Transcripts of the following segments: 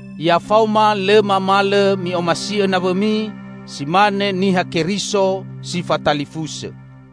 Ya faoma lõ mamalõ mi'omasi'õ nawõmi si mane Niha Keriso si fatalifusõ.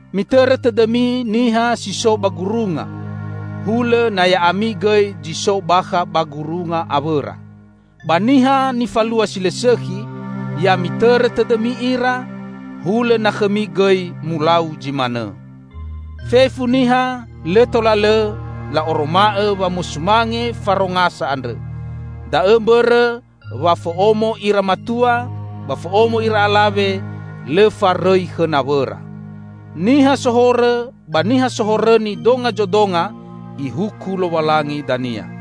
Mitõrõ tõdõmi niha si so ba gurunga, hulõ na ya'ami gõi zi so bakha ba gurunga awõra. Ba niha nifalua si lõ sõkhi, ya mitõrõ tõdõmi ira, hulõ na khõmi gõi mulau zi manõ. Fefu niha lõ tola lõ la'oroma'õ wamosumange farongasa andrõ, da'õ mbõrõ wa fo'omo ira matua ba fo'omo ira alawe lõ farõi khõ nawõra. Niha sohorõ ba niha sohorõni donga zodonga Ihuku Lowalangi dania.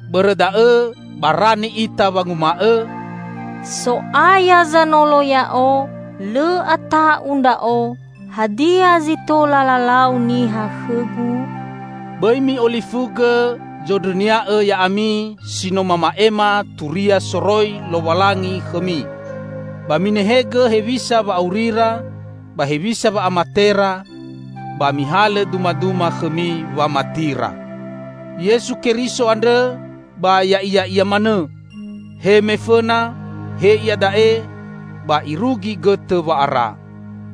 Bõrõ da'õ barani ita wanguma'õ, "So'aya Zanolo ya'o, lõ ata'u ndra'o. Hadia zi tola lalau niha khõgu?" Bõi mi'olifugõ zondrõnia'õ ya'ami si no mama'ema turia soroi Lowalangi khõmi. Ba minehegõ hewisa wa'aurira ba hewisa wa'amatera, ba mihalõ dumaduma khõmi wamatira. Yesu Keriso andrõ ba ya'iya'ia manõ, he mefõna, he iada'e, ba irugi gõtõ wa'ara.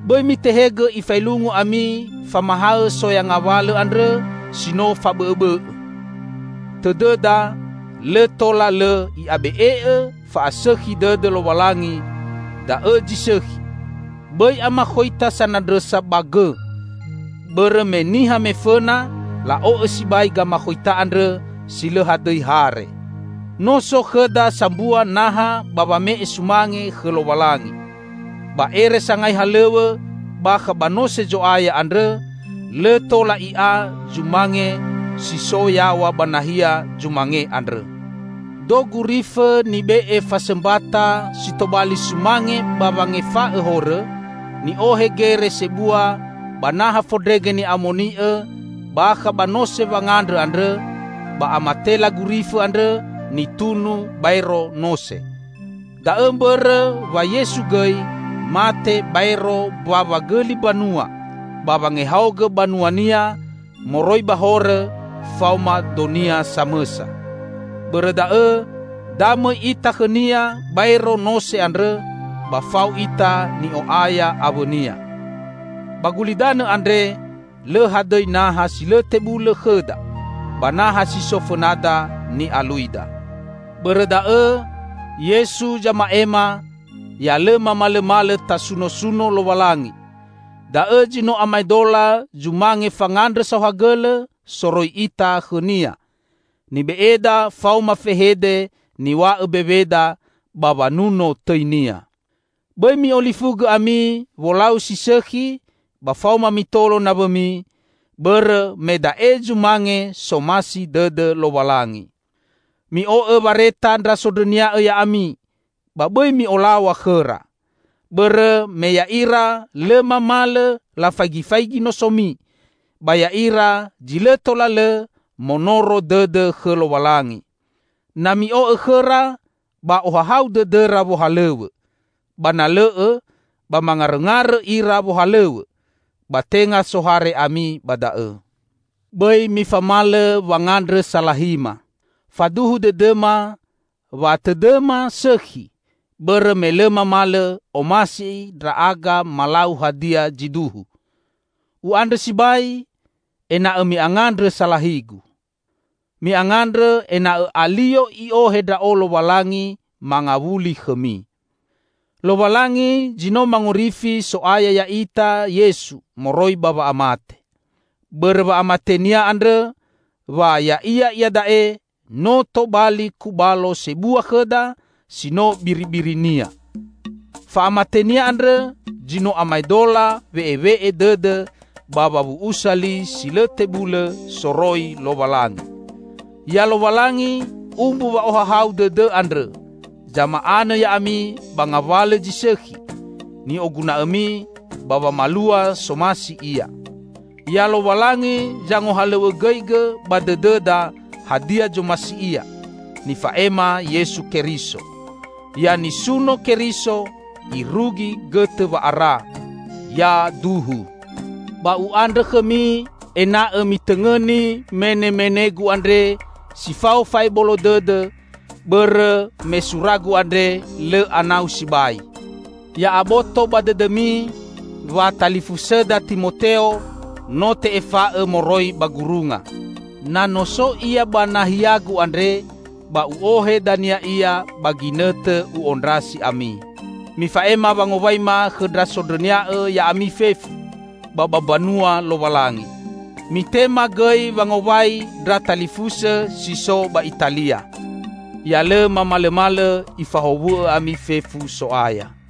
Bõi mitehegõ ifaelungu ami famahaõ soya ngawalõ andrõ si no fabõ'õbõ'õ. Tõdõda lõ tola lõ i'abe'e'õ fa'asõkhi dõdõ Lowalangi, da'õ zi sõkhi; bõi amakhoita sanandrõsa ba gõ. Bõrõ me niha me fõna la'o'õ sibai gamakhoita andrõ si lõ hadõi hare. No so khõda sambua naha ba wame'e sumange khõ Lowalangi. Ba ere sangai halõw̃õ bakha ba Nose Zo'aya andrõ, lõ tola i'a zumange si so yaw̃a ba nahia zumange andrõ. Do gurifõ nibe'e fasõmbata si tobali sumange ba wangefa'õ horõ, ni'ohe gere sebua ba Naha Fondrege Ni'amoni'õ bakha ba Nose Wangandrõ andrõ, ba amatela gurifõ andrõ nitunu baero nose. Da'õ mbõrõ wa Yesu gõi mate baero mbawa gõli mbanua ba wangehaogõ banua-Nia moroi ba horõ faoma do-Nia samõsa. Bõrõ da'õ, da mõi ita khõ-Nia baero nose andrõ ba fao ita ni'o'aya awõ-Nia. Ba gulidanõ andre lõ hadõi naha si lõ tebulõ khõda, ba naha si so fõnada ni'aluida. Bõrõ da'õ, Yesu zama'ema, ya lõ mamalõmalõ tasunosuno Lowalangi; da'õ zi no amaedola zumange fangandrõ saohagõlõ soroi ita khõ-Nia, nibe'eda faoma fehede niw̃a'õ mbeweda, ba wanuno tõi-Nia. Bõi mi'olifugõ ami wolau si sõkhi ba faoma mitolo nawõmi, bõrõ me da'e zumange somasi dõdõ Lowalangi. Mi'o'õ wareta ndra sondrõnia'õ ya'ami, ba bõi mi'olaw̃a khõra. Bõrõ me ya'ira lõ mamalõ lafaigifaigi nosomi, ba ya'ira zi lõ tola lõ monoro dõdõ khõ Lowalangi. Na mi'o'õ khõra, ba ohahau dõdõra wohalõw̃õ; ba na lõ'õ, ba mangarõngarõ ira wohalõw̃õ, ba tenga sohare ami ba da'õ. Bõi mifamalõ wangandrõ salahima. Faduhu dõdõma, wa tõdõma sõkhi, bõrõ me lõ mamalõ omasi ndra'aga malau hadia zi duhu. U'andrõ sibai, ena'õ mi'angandrõ salahigu. Mi'angandrõ ena'õ alio I'ohe ndra'o Lowalangi mangawuli khõmi. Lowalangi zi no mangorifi So'aya ya'ita Yesu moroi ba wa'amate. Bõrõ wa'amate-Nia andrõ, wa Ya'ia iada'e no tobali Kubalo Sebua khõda si no biribiri-Nia. Fa'amate-Nia andrõ zi no amaedola we'ewe'e dõdõ ba wawu'usa li si lõ tebulõ soroi Lowalangi. Ya Lowalangi, umbu wa'ohahau dõdõ andrõ, zama'anõ ya'ami ba ngawalõ zi sõkhi ni'oguna'õmi ba wamalua somasi Ia. Ya Lowalangi zangohalõw̃õgõigõ ba dõdõda hadia zomasi Ia, nifa'ema Yesu Keriso. Ya nisuno Keriso irugi gõtõ wa'ara! Yaduhu. Ba u'andrõ khõmi ena'õ mitõngõni menemenegu andre si fao fa'ebolo dõdõ, bõrõ me suragu andre lõ anau sibai. Ya'aboto ba dõdõmi wa talifusõda Timoteo no te'efa'õ moroi ba gurunga. Na no so ia ba nahiagu andre, ba u'ohe dania ia ba ginõtõ u'ondrasi ami. Mifa'ema wangowaima khõ ndra sondrõnia'õ ya'ami fefu ba ba Mbanua Lowalangi. Mitema gõi wangowai ndra talifusõ si so ba Italia. Ya lõ mamalõmalõ Ifahowu'õ ami fefu So'aya.